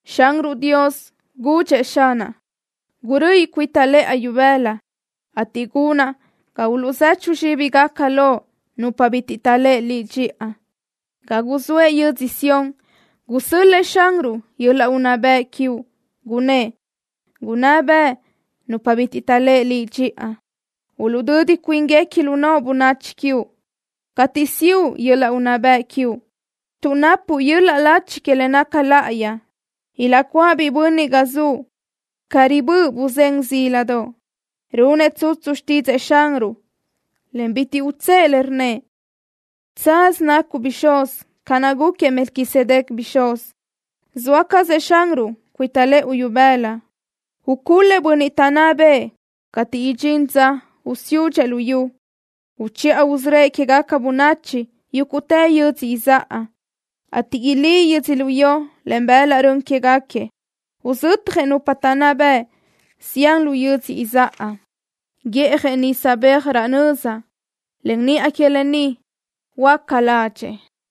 Xanruʼ Dios gudxëʼ Xanaʼ: “Guröʼi cuita lëʼa ibëla cateʼ gunraʼ ga uluʼzechu zxíbigaca loʼ nupa bitiʼ taʼléʼe Liʼ dxiʼa.” Ga zoëʼ yödzö Sión gusö́l-lëʼë Xanruʼ yöl-laʼ unná bëʼ quiuʼ, gunnë́ʼ: “Gunná beʼe nupa bitiʼ taʼléʼe Liʼ dxiʼa. Uluʼdödi cuínguequi lu noʼo bönachi quiuʼ cateʼ siʼu yöl-laʼ unná bëʼ quiuʼ tuʼ napuʼ yöl-laʼ lachi que le naca láʼayi.” Ilaʼcuáʼ biʼi bönniʼ ga zuʼ ca ribö́ʼö buzén zíladoʼ. Runëʼ tsutsu xtídzëʼë Xanruʼ, en bitiʼ utsë́ʼë le, rnnëʼ: “Tsaz nacuʼ bixúz ca naʼ gúquiëʼ Melquisedec bixúz.” Zoa cazëʼ Xanruʼ cuita lëʼu ibëla. Ucul-lëʼ bönniʼ taʼnná bëʼë cateʼ idxín dza usiúdxëʼ luyú. Uchiʼa usörö́ëʼ quégaca bönachi yúguʼtë yödzö izáʼa, ateʼ ilí yödzölió len bëlaʼ rön quéguequi. Uzötjëʼ nupa taʼnná bëʼ zián lu yödzö izáʼa. Guíʼjëʼ nisa beaj raʼ nöza, en niʼa que lë ni huöáca ládxëʼë.